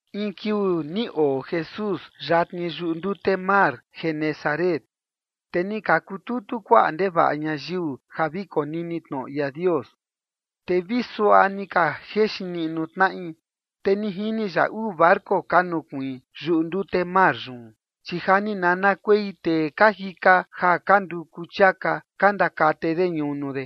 In kiuu ni oo Jesús yatni yuꞌu ndute mar Genesaret, te ni ka kututu kuaꞌa ndevaꞌa ñayiu ja vi konini tnoꞌo ia Dios, te vi suaꞌa ni ka jexin niꞌnu tnaꞌi. Te ni jini ya uu barco ka nukuiin yuꞌu ndute mar yun, chi ja ni nanakuei tee ka jika ja ka nduku chiaka ka ndakate de ñunu de.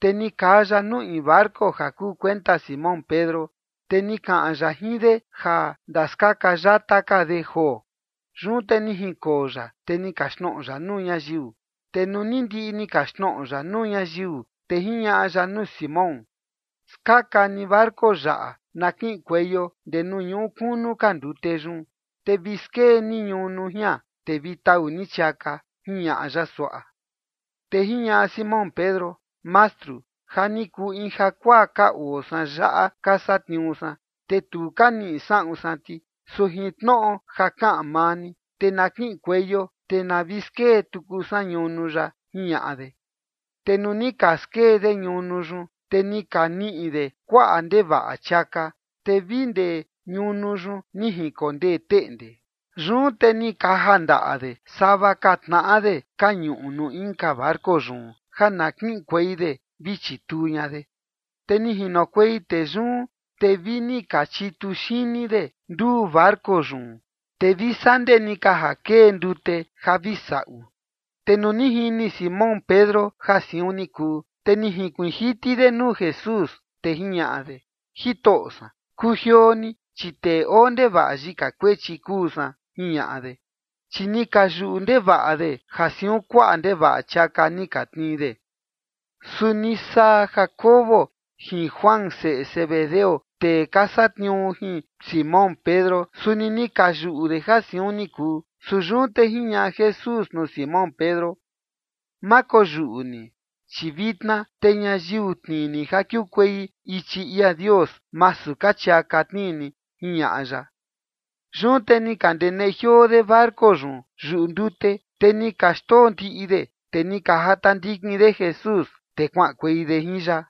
Te ni kaa ya nuu in barco ja kuu kuenta Simón Pedro, te ni kaꞌan ya jin de ja ndaskaka yata ka de joo. Yun te ni jinkoo ya, te ni kaxtnoꞌo ya nuu ñayiu. Te nuu ni ndiꞌi ni kaxtnoꞌo ya nuu ñayiu, te jiñaꞌa ya nuu Simón: ―Skaka ni barco yaꞌa na kiꞌinkueio ndee nuu ñuꞌu kunu ka ndute yun, te vi skee ni ñunu jian, te vi tau ni chiaka ―jiñaꞌa ya suaꞌa. Te jiñaꞌa Simón Pedro: ―Mastru, ja ni kuu in jakuaa ka oo san yaꞌa ka satniuu san, te tu ka niꞌi saꞌun san ti. Su jin tnoꞌo ja kaꞌan maa ni, te na kiꞌinkueio, te na vi skee tuku san ñunu yaꞌa ―jiñaꞌa de. Te nuu ni ka skee de ñunu yun, te ni ka niꞌi de kuaꞌa ndevaꞌa chiaka, te vi ndee ñunu yun ni jinkondee teꞌnde. Yun te ni ka kaja ndaꞌa de sava ka tnaꞌa de ka ñuꞌu nuu inka barco yun ja na kiꞌinkuei de vi chituu ña de. Te ni jinokuei tee yun, te vini ka chitu xini de nduu barco yun, te vi saa ndee ni ka ja kee ndute ja vi saꞌu. Te nuu ni jini Simón Pedro ja siun ni kuu, te ni jinkuiin jiti de nuu Jesús, te jiñaꞌa de: ―Jitoꞌo san, kujioo ni, chi tee oo ndevaꞌa yika kuechi kuu san ―jiñaꞌa de. Chi ni ka yuꞌu ndevaꞌa de ja siun kuaꞌa ndevaꞌa chiaka ni ka tnii de. Suni saa Jacobo jin Juan seꞌe Zebedeo tee ka satniuu jin Simón Pedro, suni ni ka yuꞌu de ja siun ni kuu. Su yun te jiñaꞌa Jesús nuu Simón Pedro: ―Ma koyuꞌu ni, chi vitna te ñayiu tnii ni ja kiukuei ichi ia Dios masu ka chiaka tnii ni ―jiñaꞌa ya. Yun te ni ka ndeneꞌe jioo de barco yun yuꞌu ndute, te ni ka xndoo ndiꞌi de, te ni ka jata ndikin de Jesús, te kuaꞌankuei de jin ya.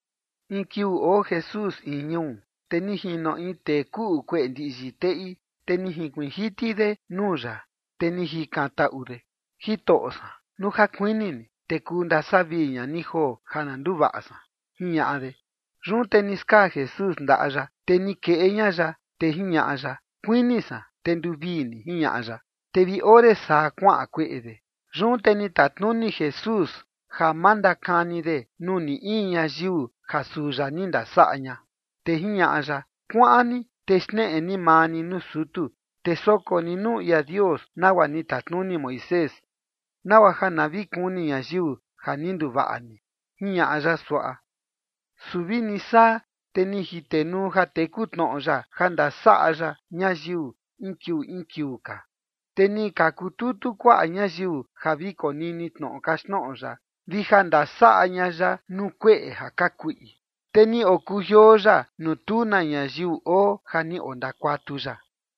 In kiuu oo Jesús in ñuu, te ni jino in tee kuꞌu kueꞌe ndiꞌyi teꞌi, te ni jinkuiin jiti de nuu ya, te ni jikantaꞌu de: ―Jitoꞌo san, nuu ja kuini ni, te kuu ndasavii ña ni joo ja na nduvaꞌa san ―jiñaꞌa de. Yun te ni skaa Jesús ndaꞌa ya, te ni keꞌe ña ya, te jiñaꞌa ya: ―Kuini san, te nduvii ni ―jiñaꞌa ya. Te vi ore saa kuaꞌan kueꞌe yun. Yun te ni tatnuni Jesús ja ma ndakani de nuu ni in ñayiu ja suu ya ni ndasaꞌa ña. Te jiñaꞌa ya: ―Kuaꞌan ni, te xneꞌe ni maa ni nuu sutu, te soko ni nuu ia Dios nagua ni tatnuni Moisés, nagua ja na vi kuni ñayiu ja ni nduvaꞌa ni ―jiñaꞌa ya suaꞌa. Su vini saa, te ni jitenuu ja teku tnoꞌo ya ja ndasaꞌa ya ñayiu in kiuu in kiuu ka. Te ni ka kututu kuaꞌa ñayiu ja vi konini tnoꞌo kaxtnoꞌo ya vi ja ndasaꞌa ña ya nuu kueꞌe ja ka kuꞌi. Te ni okujioo ya nuu tu na ñayiu oo ja ni ondakuatu ya.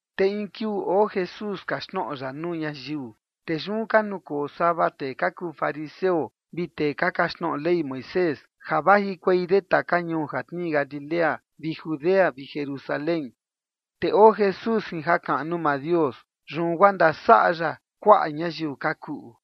Te in kiuu oo Jesús kaxtnoꞌo ya nuu ñayiu. Te yun ka nukoo sava tee ka kuu fariseo vi tee ka kaxtnoꞌo Ley Moisés ja vajikuei de taka ñuu ja tnii Galilea vi Judea vi Jerusalén. Te oo Jesús jin jakaꞌnu maa Dios, yun guaa ndasaꞌa ya kuaꞌa ñayiu ka kuꞌu.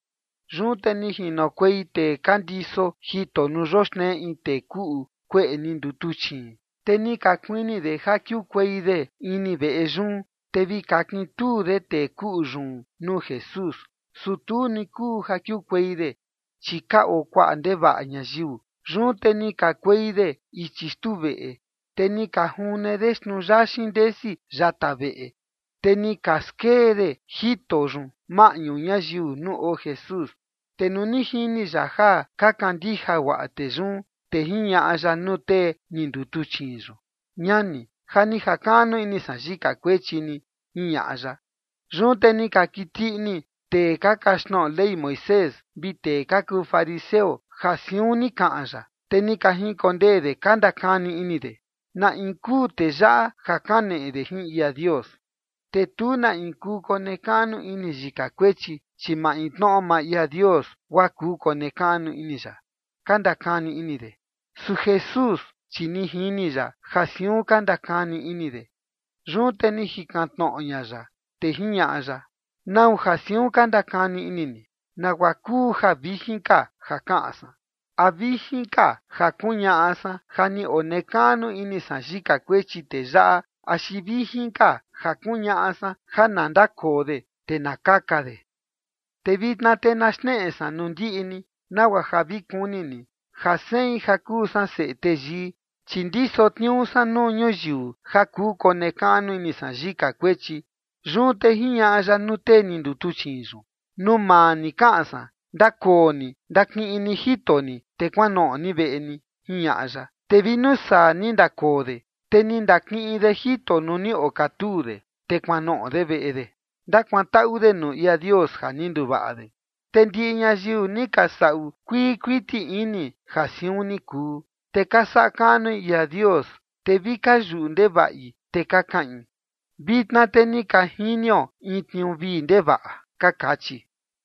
Yun te ni jinokuei tee ka ndiso jito nuu yoxnee in tee kuꞌu kueꞌe ni ndutuchiin. Te ni ka kuini de ja kiukuei de ini veꞌe yun, te vi kakintuu de tee kuꞌu yun nuu Jesús. Su tu ni kuu ja kiukuei de, chi ka oo kuaꞌa ndevaꞌa ñayiu. Yun te ni kakuei de ichi xtuu veꞌe, te ni ka june de xnuu yaxin ndesi yata veꞌe, te ni ka skee de jito yun maꞌñu ñayiu nuu oo Jesús. Te nuu ni jini ya ja ka kandija guaꞌa tee yun, te jiñaꞌa ya nuu tee ni ndutuchiin yun: ―Ñani, ja ni jakaꞌnu ini san yika kuechi ni ―jiñaꞌa ya. Yun te ni ka kiti ini tee ka kaxtnoꞌo Ley Moisés vi tee ka kuu fariseo ja siun ni kaꞌan ya, te ni ka jinkondee de ka ndakani ini de: ―¿Na in kuu tee yaꞌa ja kaneꞌe de jin ia Dios? Te tu na in kuu konekaꞌnu ini yika kuechi, chi maintnoꞌo maa ia Dios guaa kuu konekaꞌnu ini ya ―ka ndakani ini de. Su Jesús, chi ni jini ya ja siun ka ndakani ini de. Yun te ni jikan tnoꞌo ña ya, te jiñaꞌa ya: ―¿Nau ja siun ka ndakani ini ni? ¿Nagua kuu ja vijin ka ja kaꞌan san? ¿A vijin ka ja kuñaꞌa san ja ni onekaꞌnu ini san yika kuechi tee yaꞌa, axi vijin ka ja kuñaꞌa san ja na ndakoo de te na kaka de? Te vitna te na xneꞌe san nuu ndiꞌi ni nagua ja vi kuni ni ja sein ja kuu san Seꞌe Teyii, chi ndiso tniuu san nuu ñuyiu ja kuu konekaꞌnu ini san yika kuechi. Yun te jiñaꞌa ya nuu tee ni ndutuchiin yun: ―Nuu maa ni kaꞌan san, ndakoo ni ndakiꞌin ni jito ni, te kuanoꞌo ni veꞌe ni ―jiñaꞌa ya. Te vi nuu saa, ni ndakoo de, te ni ndakiꞌin de jito nuu ni okatuu de, te kuanoꞌo de veꞌe de, ndakuantaꞌu de nuu ia Dios ja ni nduvaꞌa de. Te ndiꞌi ñayiu ni ka saꞌu kuii kuiti ini ja siun ni kuu, te ka saꞌa kaꞌnui ia Dios, te vi ka yuꞌu ndevaꞌi, te ka kaꞌin: ―Vitna te ni ka jinio in tniuu vii ndevaꞌa ―ka kachi.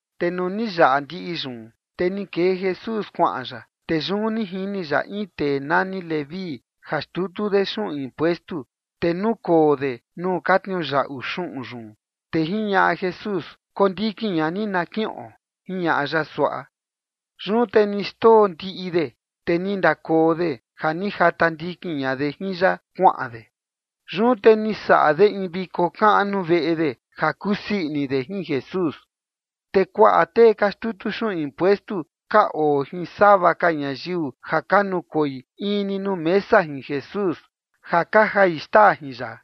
Te nuu ni yaꞌa ndiꞌi yun, te ni kee Jesús kuaꞌan ya, te yun ni jini ya in tee nani Leví ja xtutu de xuꞌun impuestu, te nukoo de nuu ka tniuyaꞌu xuꞌun yun, te jiñaꞌa Jesús: ―Kondikin ña ni na kiꞌon ―jiñaꞌa ya suaꞌa. Yun te ni xndoo ndiꞌi de, te ni ndakoo de ja ni jata ndikin ña de jin ya kuaꞌan de. Yun te ni saꞌa de in viko kaꞌnu veꞌe de ja kusii ini de jin Jesús. Te kuaꞌa tee ka xtutu xuꞌun impuestu ka oo jin sava ka ñayiu ja ka nukoi in ni nuu mesa jin Jesús, ja ka jai xtaa jin ya.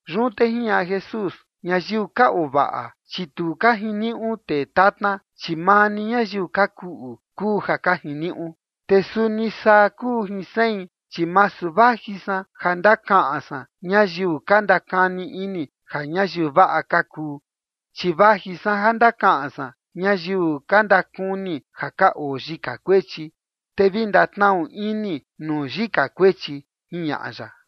Yun te jiñaꞌa Jesús: ―Ñayiu ka oo vaꞌa, chi tu ka jiniuꞌu tee tatna, chi maa ni ñayiu ka kuꞌu kuu ja ka jiniuꞌu. Te suni saa kuu jin sein, chi masu vaji san ja ndakaꞌan san ñayiu ka ndakani ini ja ñayiu vaꞌa ka kuu, chi vaji san ja ndakaꞌan san ñayiu ka ndakuni ja ka oo yika kuechi, te vi ndatnaꞌu ini nuu yika kuechi ―jiñaꞌa ya.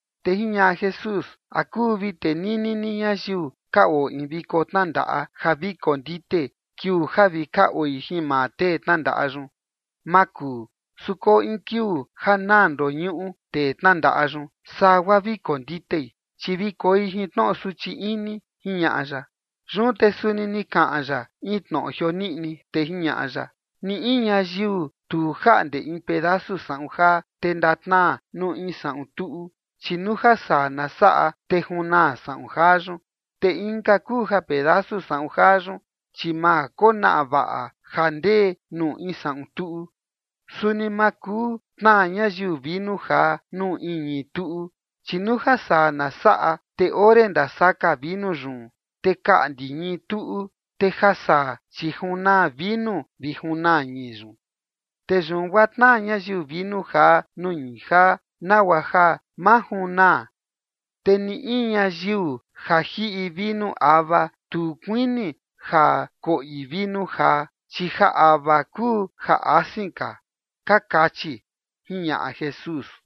Te jiñaꞌa Jesús: ―¿A kuu vi tenini ni ñayiu ka oo in viko tnandaꞌa ja vi kondite kiuu ja vi ka oi jin maa tee tnandaꞌa yun? Maa kuu. Su koo in kiuu ja naa ndoñuꞌu tee tnandaꞌa yun, saa guaa vi konditei, chi vi koi jin tnoꞌo suchi ini ―jiñaꞌa ya. Yun te suni ni kaꞌan ya in tnoꞌo jioniꞌni, te jiñaꞌa ya: ―Ni in ñayiu tu jaꞌnde in pedasu saꞌun jaa, te ndatnaa nuu in saꞌun tuꞌu, chi nuu ja saa na saꞌa, te junaa saꞌun jaa yun. Te inka kuu ja pedasu saꞌun jaa yun, chi ma konaꞌa vaꞌa ja ndee nuu in saꞌun tuꞌu. Suni ma kuu tnaa ñayiu vinu jaa nuu in ñii tuꞌu, chi nuu ja saa na saꞌa, te ore ndasaka vinu yun, te kaꞌndi ñii tuꞌu, te ja saa chi junaa vinu vi junaa ñii yun. Te yun guaa tnaa ñayiu vinu jaa nuu ñii jaa nagua ja ma junaa. Te ni in ñayiu ja jiꞌi vinu ava tu kuini ja koꞌi vinu jaa, chi ja ava kuu ja asin ka, ka kachi ―jiñaꞌa Jesús.